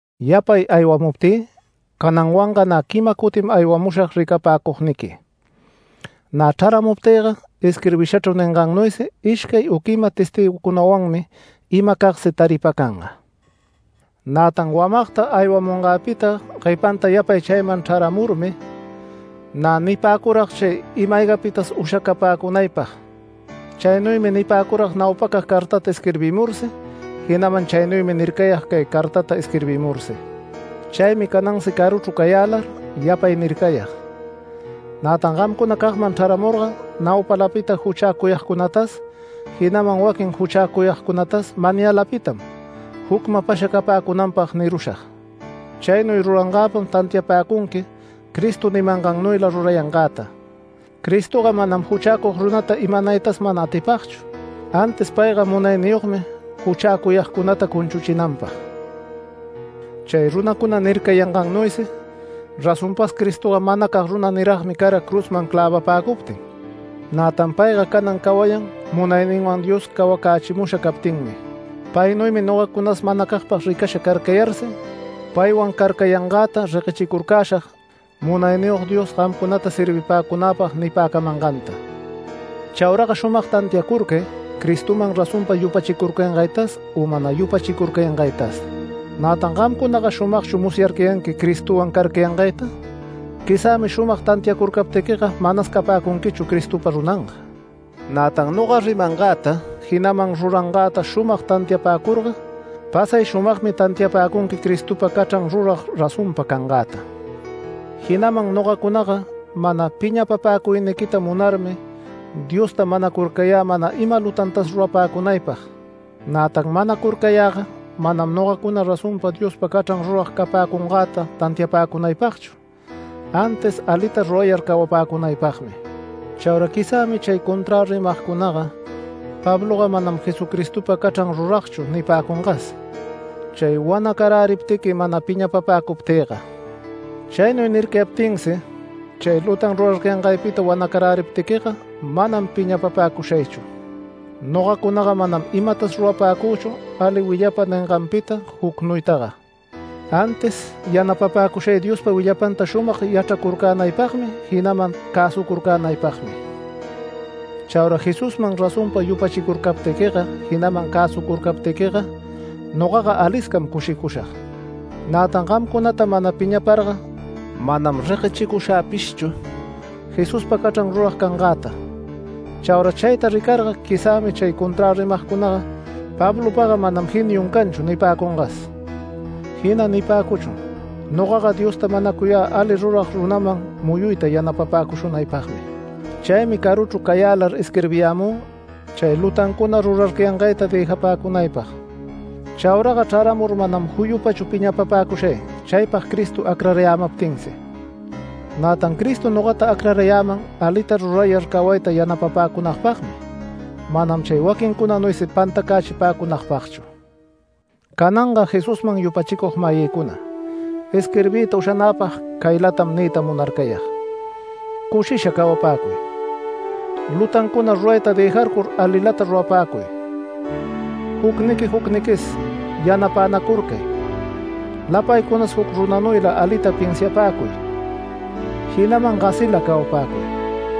Yapay aywamuptï cananwanga nä quima cutim aywamushag ricapäcugniqui. Nä chraramuptïga isquirbishachru ningannuysi ishcay u quima testïgucunawanmi imacagsi taripacanga. Nätan wamagta aywamungäpita guepanta yapay chayman chraramurmi nä nipäcurag chay ima-aygapitas ushacapäcunaypag. Chaynuymi nipäcurag naupacag cartata isquirbimursi, jinaman chaynuymi nircayag cay cartata isquirbimursi. Chaymi canansi caruchru cayälar yapay nircayag. Nätan gamcunacagman chrämurga naupalapita juchäcuyagcunatas, jinaman waquin juchäcuyagcunatas mayänilapitam jucmapasha capäcunanpag nirushag. Chaynuy rurangäpam tantiapäcunqui Cristo nimangannuyla rurayangäta. Cristoga manam juchäcug runata imanaytas mana atipagchu, antis payga munayniyogmi juchäcuyagcunata cunchuchinanpag. Chay runacuna nircayangannuysi razonpas Cristoga manacag runa niragmi cara cruzman clävapäcuptin. Nätan payga canan cawayan munayninwan Dios cawacächimusha captinmi. Paynuymi nogacunas manacagpag ricasha carcayarsi paywan carcayangäta reguechicurcäshag Munayniyog Dios gamcunata servipäcunäpag nipäcamanganta. Chauraga shumag tantiacurcay Cristoman razonpa yupachicurcangaytas u mana yupachicurcangaytas. ¿Nätan gamcunaga shumagchu musyarcayanqui Cristowan carcayangayta? Quizä shumag tantiacurcaptiquiga manas capäcunquichu Cristopa runanga. Nätan noga rimangäta jinaman rurangäta shumag tantiapäcurga pasay shumagmi tantiapäcunqui Cristopa cachran rurag razonpa cangäta. Jinaman nogacunaga mana piñapapäcuyniquita munarmi Diosta manacurcayä mana ima lutantas rurapäcunaypag. Nätan manacurcayäga manam nogacuna razonpa Diospa cachran rurag capäcungäta tantiapäcunaypagchu, antis alita rurayar cawapäcunaypagmi. Chaura quizämi chay conträ rimagcunaga “Pabloga manam Jesucristopa cachran ruragchu” nipäcungas, chay wanacaräriptiqui mana piñapapäcuptïga. Chaynuy nircayaptinsi chay lutan rurarcayangaypita wanacaräriptiquiga manam piñapapäcushaychu. Nogacunaga manam imatas rurapäcüchu ali willapa ninganpita jucnuytaga, antis yanapapäcushay Diospa willapanta shumag yachracurcänaypagmi, jinaman cäsucurcänaypagmi. Chaura Jesusman razonpa yupachicurcaptiquiga, jinaman cäsucurcaptiquiga nogaga aliscam cushicushag. Nätan gamcunata mana piñaparga manam reguechicushäpishchu Jesuspa cachran rurag cangäta. Chaura chayta ricarga quizämi chay conträ rimagcunaga “Pablopaga manam geniun canchu” nipäcungas, jina nipäcuchun nogaga Diosta manacuyä ali rurag runaman muyuyta yanapapäcushunaypagmi. Chaymi caruchru cayälar isquirbiyämü chay lutancuna rurarcayangayta dëjapäcunaypag. Chauraga chraramur manam juyupachu piñapapäcushay, chaypag Cristo acrarayämaptinsi. Nätan Cristo nogata acrarayäman alita rurayar cawayta yanapapäcunagpagmi, manam chay waquincunanuysi pantacächipäcunapagchu. Cananga Jesusman yupachicug-mayïcuna, isquirbiyta ushanäpag caylatam niyta munarcayag: Cushisha cawapäcuy, lutancuna rurayta dëjarcur alilata rurapäcuy, jucniqui jucniquis yanapänacurcay, lapaycunas juc runanuyla alita pinsiapäcuy, jinaman gasila cawapäcuy.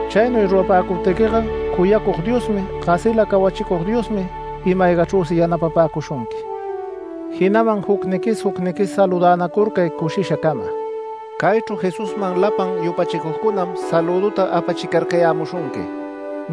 Chaynuy rurapäcuptiquiga cuyacug Diosmi, gasila cawachicug Diosmi ima-aygachrüsi yanapapäcushunqui. Jinaman jucniquis jucniquis saludänacurcay cushishacama. Caychru Jesusman lapan yupachicugcunam salüduta apachicarcayämushunqui.